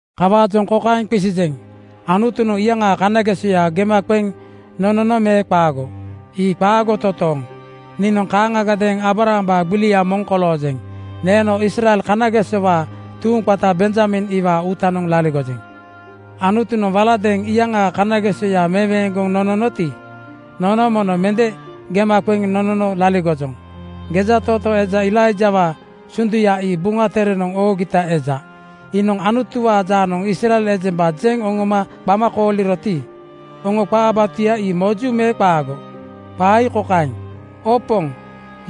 Kawaajoŋ kokaeŋ qisijeŋ: Anutunoŋ iyaŋaa kanagesoya gema qeŋ nonono me qaago? Ii qaago totooŋ! Niinoŋ kaaŋagadeeŋ Aabrahambaa gbilia moŋ koloojeŋ. Neeno Israel kanagesowaa tuuŋ qata Benjamin iwaa uutanoŋ laligojeŋ. Anutunoŋ waladeeŋ iyaŋaa kanagesoya meweeŋgoŋ nononoti, nono mono mende gema qeŋ nonono laligojoŋ. Gejatootoo eja Elaijawaa (Eliawaa) sunduya ii Buŋa Terenoŋ oogita eja. Iinoŋ Anutuwaa jaanoŋ Israel ejemba jeŋ oŋoma qama kooliroti, oŋo qaa batuya ii moju me qaago? Qaa ii kokaeŋ, “Oo Poŋ,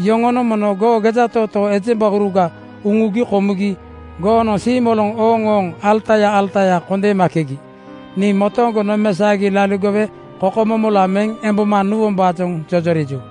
yoŋonoŋ mono goo gejatootoo ejembauruga uŋugi komugi goonoŋ siimoloŋ ooŋooŋ alataya alataya kondemondeeŋgi. Nii motooŋgo nomesaogi laligowe kokomomola meŋ emboma nuwombaajoŋ jojoriju.”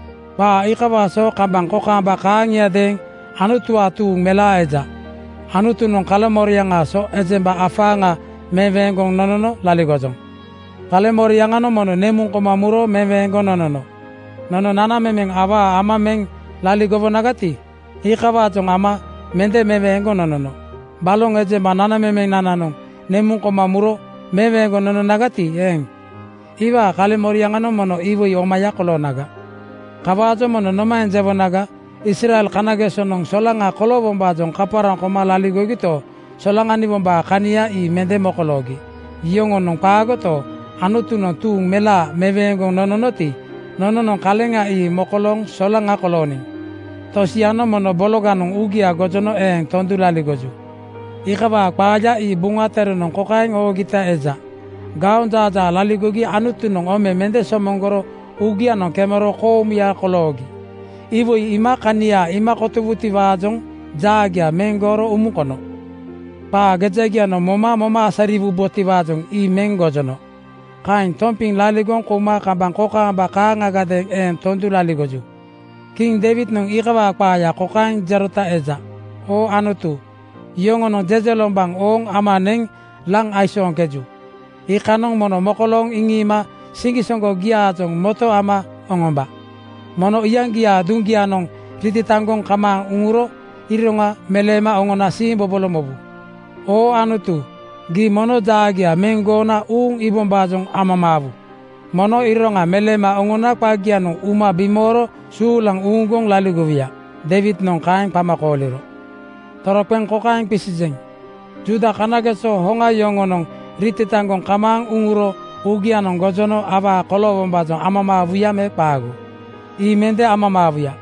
Qaa iikawaa so kambaŋ kokaamba kaaŋiadeeŋ Anutuwaa tuuŋ melaa eja. Anutunoŋ kaleŋmoriaŋaa so ejemba afaaŋa meweeŋgoŋ nonono laligojoŋ. Kaleŋmoriaŋanoŋ mono nemuŋ koma muro meweeŋgoŋ nonono. Nono nanamemeŋ awaa ama meŋ laligowonagati, iikawaajoŋ ama mende meweeŋgoŋ nonono. Baloŋ ejemba nanamemenananoŋ nemuŋ koma muro meweeŋgoŋ nononagati eeŋ, iwaa kaleŋmoriaŋanoŋ mono iwoi omaya koloonaga. Kawaajoŋ mono nomaeŋ jewonaga? Israel kanagesonoŋ solaŋa koloowombaajoŋ kaparaŋ koma laligogito, solaŋaniwombaa kania ii mende mokoloogi. Yoŋonoŋ qaagoto, Anutunoŋ tuuŋ melaa meweeŋgoŋ nononoti, nononoŋ kaleŋa ii mokolooŋ solaŋa kolooniŋ. Tosianoŋ momo bologanoŋ uugia gojono eeŋ tondu laligoju. Iikawaa qaaya ii Buŋa Terenoŋ kokaeŋ oogita eja, “Gaonjaajaa laligogi Anutunoŋ ome mende somoŋgoro uugianoŋ kemero koomuya koloogi. Iwoi iima kania iima kotowubotiwaajoŋ jaagia meŋ gooro umuŋ kono. Qaa gejagianoŋ moma moma asariwubotiwaajoŋ ii meŋ gojono. Kaeŋ tompiŋ laligoŋ kouma kambaŋ kokaamba kaaŋagadeeŋ eeŋ tondu laligoju.” Kiŋ Deiwidnoŋ iikawaa qaaya kokaeŋ jerota eja, “Oo Anutu, yoŋonoŋ jejelombaŋ ooŋ ama neŋ laŋ aisooŋkeju. Iikanoŋ mono mokolooŋ iŋiima siŋgisoŋgogiaajoŋ moto ama oŋomba. Mono iyaŋgiaa duŋgianoŋ ritataŋgoŋ kamaaŋ uŋuro iroŋa meleema oŋona siimbobolo mobu. Oo Anutu, gii mono jaagia meŋ goona uuŋ iibombaajoŋ amamaawu. Mono iroŋa meleema oŋona qagianoŋ uma bimooro suulaŋ uuŋgoŋ laligowuya.” Deiwidnoŋ kaeŋ qama kooliro. Toroqeŋ kokaeŋ qisijeŋ: Juuda kanageso hoŋa yoŋonoŋ ritataŋgoŋ kamaaŋ uŋuro uugianoŋ gojono awaa koloowombaajoŋ amamaawuya me qaago? Ii mende amamaawuya!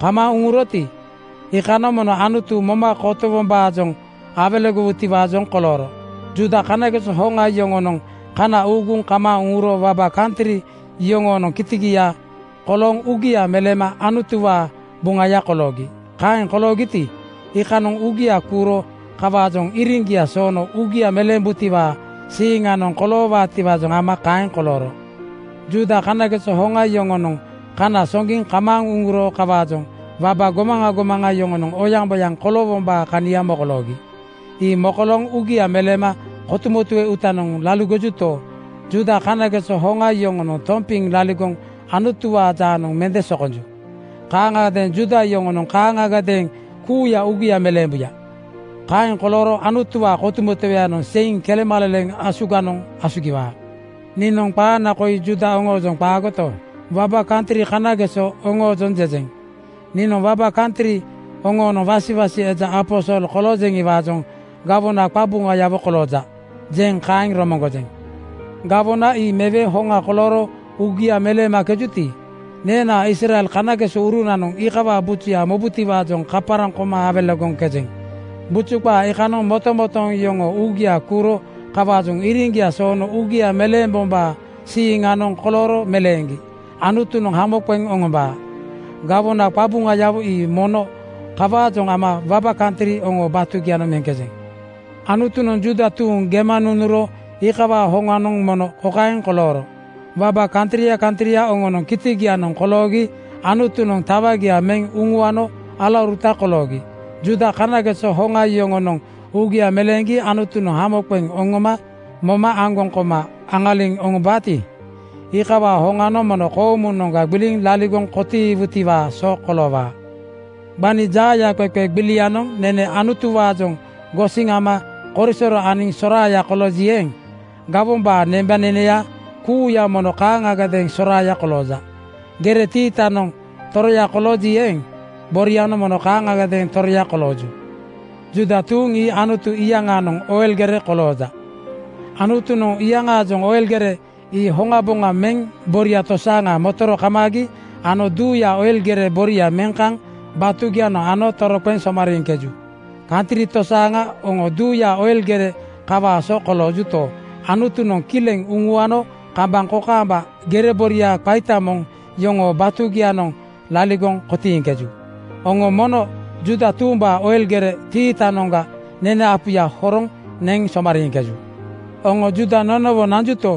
Kamaaŋ uŋuroti, iikanoŋ mono Anutu moma kotowombaajoŋ awelegowutiwaajoŋ kolooro. Juuda kanageso hoŋa yoŋonoŋ kana uuguŋ kamaaŋ uŋuro waba kantri yoŋonoŋ kitigia kolooŋ uugia meleema Anutuwaa buŋaya koloogi. Kaeŋ koloogiti, iikanoŋ uugia kuuro kawaajoŋ iriŋgia soono uugia meleembutiwaa siiŋanoŋ koloowaatiwaajoŋ ama kaeŋ kolooro. Juuda kanageso hoŋa yoŋonoŋ kana soŋgiŋ kamaaŋ uŋuro kawaajoŋ waba gomaŋa gomaŋa yoŋonoŋ oyaŋboyaŋ koloowombaa kania mokoloogi. Ii mokolooŋ uugia meleema kotumotue uutanoŋ laligojuto, Juuda kanageso hoŋa yoŋonoŋ tompiŋ laligoŋ Anutuwaa jaanoŋ mende sokonju. Kanageŋ Juuda yoŋonoŋ kaaŋagadeeŋ kuuya uugia meleembuya. Kaeŋ kolooro Anutuwaa kotumotueyanoŋ seiŋ kelemaleleŋ asuganoŋ asugiwaa. Niinoŋ qaana koi Juuda oŋoojoŋ qaagoto, waba kantri kanageso oŋoojoŋ jejeŋ. Niinoŋ waba kantri oŋoonoŋ wasiwasi eja aposol koloojeŋiwaajoŋ “Gawona qabuŋayawo kolooja,” jeŋ kaeŋ romoŋgojeŋ. Gawona ii mewe hoŋa kolooro uugia meleemakejuti, neenaa Israel kanagesourunanoŋ iikawaa bujuya mobutiwaajoŋ kaparaŋ koma awelegoŋkejeŋ. Buju qaa iikanoŋ motomotooŋ yoŋoo uugia kuuro kawaajoŋ iriŋgia soono uugia meleembombaa siiŋanoŋ kolooro meleeŋgi Anutunoŋ hamo qeŋ oŋombaa. Gawona qabuŋayawo ii mono kawaajoŋ ama waba kantri oŋoo batugianoŋ meŋkejeŋ. Anutunoŋ Juuda tuuŋ gema nunuro iikawaa hoŋanoŋ mono kokaeŋ kolooro: Waba kantria kantria oŋonoŋ kitigianoŋ koloogi Anutunoŋ tawagia meŋ uŋuano alauruta koloogi. Juuda kanageso hoŋa yoŋonoŋ uugia meleeŋgi Anutunoŋ hamo qeŋ oŋoma moma aŋgoŋ koma aŋaliŋ oŋombaati, iikawaa hoŋanoŋ mono koomunoŋga gbiliŋ laligoŋ kotiiwutiwaa so koloowaa. Gbani jaayaqeqe gbilianoŋ nene Anutuwaajoŋ gosiŋ ama korisoro aniŋ soraaya kolooji eeŋ, gawombaa nembaneneya kuuya mono kaaŋagadeeŋ soraaya kolooja. Gere tiitanoŋ toroya kolooji eeŋ, borianoŋ mono kaaŋagadeeŋ toroya kolooju. Juuda tuuŋ ii Anutu iyaŋaanoŋ oil gerega kolooja. Anutunoŋ iyaŋaanoŋ oil gere ii hoŋaboŋa meŋ boria tosaaŋa motoro kamaagi ano duuyaa oil gere boria meŋ kaŋ batugianoŋ ano toroqeŋ somariiŋkeju. Kantri tosaaŋa oŋo duuyaa oil gere kawaa so koloojuto, Anutunoŋ kileŋ uŋuano kambaŋ kokaamba gere boria qaita moŋ yoŋoo batugianoŋ laligoŋ kotiiŋkeju. Oŋo mono Juuda tuumbaa oil gere tiitanoŋga nene apuya horoŋ neŋ somariiŋkeju. Oŋo Juuda nonowo nanjuto,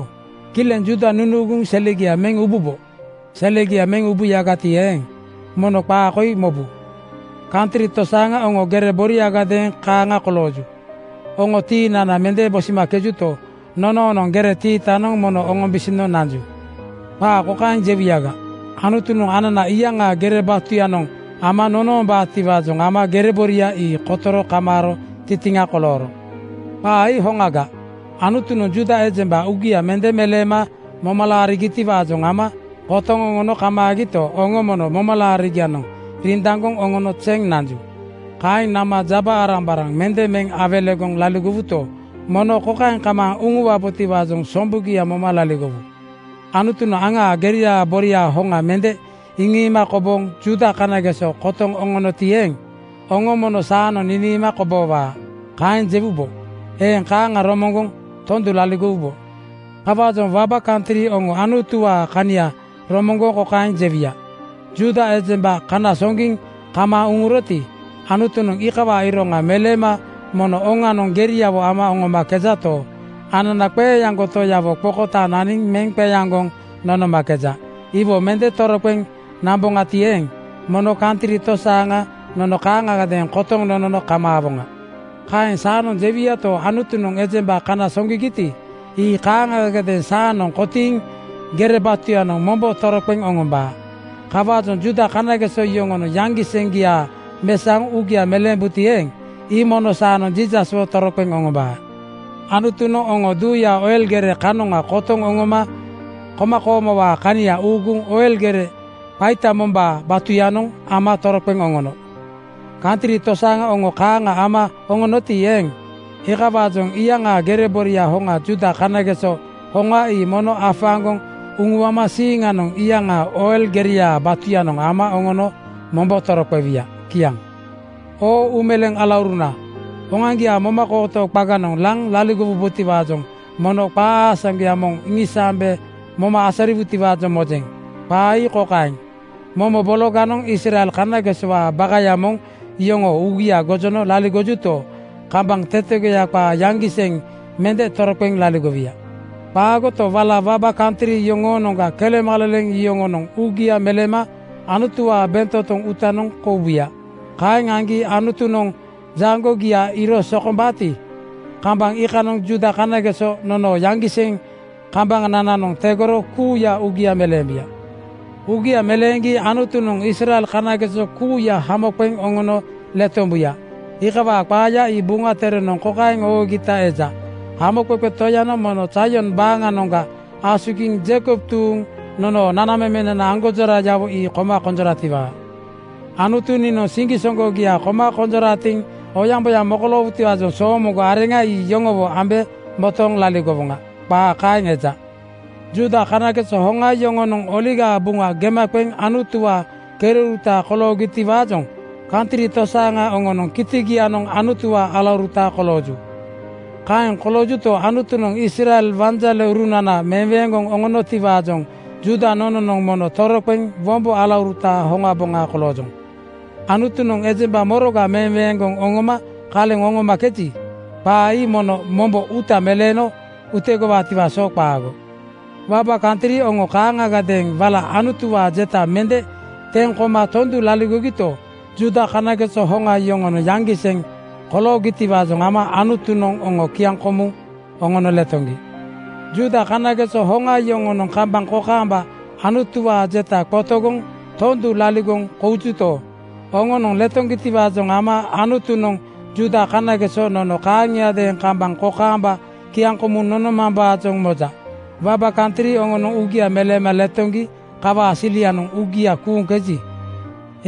kileŋ Juuda nunuuguŋ selegia meŋ ububo. Selegia meŋ ubuyagati eeŋ, mono qaa koi mobu: Kantri tosaaŋa oŋo gere boriagadeeŋ kaaŋa kolooju. Oŋo tiinana mende bosimakejuto, nonoonoŋ gere tiitanoŋ mono oŋombosino nanju. Qaa kokaeŋ jewuyaga, “Anutunoŋ anana iyaŋaa gere batuyanoŋ ama nonombaatiwaajoŋ ama gere boria ii kotoro kamaaro tintiŋa kolooro.” Qaa ii hoŋaga. Anutunoŋ Juuda ejemba uugia mende meleema moma laarigitiwaajoŋ ama kotoŋ oŋono kamaagito, oŋo mono momalaarigianoŋ rindaŋgoŋ oŋono zeŋ nanju. Kaeŋ nama jaba-arambaraŋ mende meŋ awelegoŋ laligowuto, mono kokaeŋ kamaaŋ uŋuwabotiwaajoŋ sombugia moma laligowu: Anutunoŋ aŋaa geriaa boria hoŋa mende iŋiima kobooŋ Juuda kanageso kotoŋ oŋonoti eeŋ, oŋo mono “Saanoŋ niniima koboowaa,” kaeŋ jewubo. Eeŋ kaaŋa romoŋgoŋ tondu laligowubo. Kawaajoŋ waba kantri oŋo Anutuwaa kania romoŋgoŋ kokaeŋ jewuya, “Juuda ejemba kana soŋgiŋ kamaaŋ uŋuroti, Anutunoŋ iikawaa iroŋa meleema mono oŋanoŋ geriawo ama oŋomakejato, anana qeeaŋgo Toyawo qokotaaŋ naniŋ meŋ qeaŋgoŋ nonomakeja. Iwo mende toroqeŋ namboŋati eeŋ, mono kantri tosaaŋa nono kaaŋagadeeŋ kotoŋ nonono kamaawoŋa.” Kaeŋ saanoŋ jewuyato, Anutunoŋ ejemba kana soŋgigiti, ii kaaŋagadeeŋ saanoŋ kotiiŋ gere batuyanoŋ mombo toroqeŋ oŋombaa. Kawaajoŋ Juuda kanageso yoŋonoŋ yaŋgiseŋgia mesaoŋ uugia meleembuti eeŋ, ii mono saanoŋ Jiisaswo toroqeŋ oŋombaa. Anutunoŋ oŋo duuyaa oil gere kanoŋa kotoŋ oŋoma komakoomowaa kania uuguŋ oil gere qaita mombaa batuyanoŋ ama toroqeŋ oŋono. Kantri tosaaŋa oŋo kaaŋa ama oŋonoti eeŋ, iikawaajoŋ iyaŋaa gere boria hoŋa Juuda kanageso hoŋa ii mono afaaŋgoŋ uŋuama siiŋanoŋ iyaŋaa oil geriaa batuyanoŋ ama oŋono mombo toroqewuya. Kiaŋ. Oo uumeleeŋ alauruna, oŋoaŋgiaa momakooto qaganoŋ laŋ laligowubotiwaajoŋ mono qaa aasaŋgoya moŋ iŋisaambe moma asariwutiwaajoŋ mojeŋ. Qaa ii kokaeŋ: Momo bologanoŋ Israel kanagesowaa bakaya moŋ yoŋoo uugia gojono laligojuto, kambaŋ tetegoya qaa yaŋgiseŋ mende toroqeŋ laligowuya. Qaagoto, wala waba kantri yoŋoonoŋga kelemaleleŋ yoŋonoŋ uugia meleema Anutuwaa bentotoŋ uutanoŋ koubuya. Kaeŋ aŋgi Anutunoŋ jaŋgogia iiro sokombaati, kambaŋ iikanoŋ Juuda kanageso nonoo yaŋgiseŋ kambanananoŋ tegoro kuuya uugia meleembuya. Uugia meleeŋgi Anutunoŋ Israel kanageso kuuya hamo qeŋ oŋono letombuya. Iikawaa qaaya ii Buŋa Terenoŋ kokaeŋ oogita eja, “Hamoqeqe Toyanoŋ mono Zaion baaŋanoŋga asugiŋ Jeikob tuuŋ nonoo nanamemenana aŋgonjorayawo ii koma konjoratiwaa. Anutu niinoŋ siŋgisoŋgogia koma konjoratiŋ oyaŋboyaŋ mokoloowutiwaajoŋ soomoŋgo areŋa ii yoŋowo ambe motooŋ laligowoŋa.” Qaa kaeŋ eja. Juuda kanageso hoŋa yoŋonoŋ Oligaa Buŋa gema qeŋ Anutuwaa kereuruta koloogitiwaajoŋ kantri tosaaŋa oŋonoŋ kitigianoŋ Anutuwaa alauruta kolooju. Kaeŋ koloojuto, Anutunoŋ Israel wanjaleurunana meweeŋgoŋ oŋonotiwaajoŋ Juuda nononoŋ mono toroqeŋ wombo alauruta hoŋaboŋa koloojoŋ. Anutunoŋ ejemba moroga meweeŋgoŋ oŋooma kaleŋ oŋomakeji, qaa ii mono mombo uuta meleeno utegowaatiwaa so qaago. Waba kantri oŋo kaaŋagadeeŋ wala Anutuwaa jeta mende teŋ koma tondu laligogito, Juuda kanageso hoŋa yoŋonoŋ yaŋgiseŋ koloogitiwaajoŋ ama Anutunoŋ oŋo kiaŋkomuŋ oŋono letoŋgi. Juuda kanageso hoŋa yoŋonoŋ kambaŋ kokaamba Anutuwaa jeta qotogoŋ tondu laligoŋ koujuto, oŋonoŋ letoŋgitiwaajoŋ ama Anutunoŋ Juuda kanageso nono kaaŋiadeeŋ kambaŋ kokaamba kiaŋkomuŋ nonomambaajoŋ moja. Waba kantri oŋonoŋ uugia meleema letoŋgi kawaa silianoŋ uugia kuuŋkeji,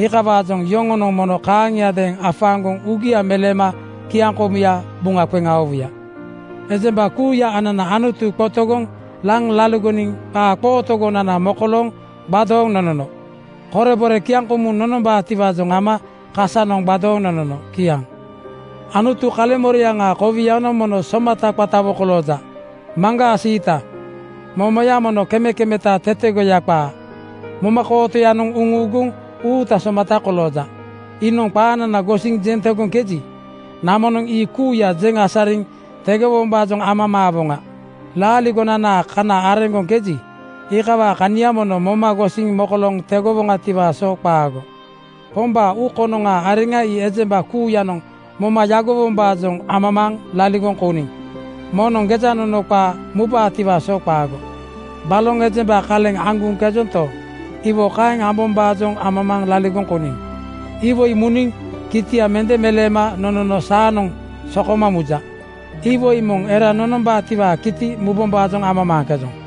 iikawaajoŋ yoŋonoŋ mono kaaŋiadeeŋ afaaŋgoŋ uugia meleema kiaŋkomuya buŋa qeŋ aowuya. Ejemba kuuya anana Anutu qotogoŋ laŋ laligoniŋ qaa qootogonana mokolooŋ gbadooŋ nonono. Korebore kiaŋkomuŋ nonombaatiwaajoŋ ama kasanoŋ gbadooŋ nonono. Kiaŋ. Anutu kaleŋmoriaŋaa kowianoŋ mono somata qatawo kolooja. Maŋgaa siita, momoya mono kemekemeta tetegoya qaa. Momakootoyanoŋ nunuuguŋ uuta somata kolooja. Iinoŋ qaanana gosiŋ jeŋ tegoŋkeji, nononoŋ ii kuuya jeŋ asariŋ tegowombaajoŋ amamaawoŋa. Laaligonanaa kana areŋgoŋkeji, iikawaa kania mono moma gosiŋ mokolooŋ tegowoŋatiwaa so qaago. “Pombaa uu konoŋaa areŋa ii ejemba kuuyanoŋ moma yagowombaajoŋ amamaaŋ laligoŋ kouniŋ. Moŋnoŋ gejanono qaa mubaatiwaa so qaago.” “Baloŋ ejemba kaleŋ aŋguŋkejonto, iwo kaeŋ ambombaajoŋ amamaaŋ laligoŋ kouniŋ. Iwoi muniŋ kitia mende meleema nonono saanoŋ sokoma muja. Iwoi moŋ era nonombaatiwaa kiti mubombaajoŋ amamaaŋkejoŋ.”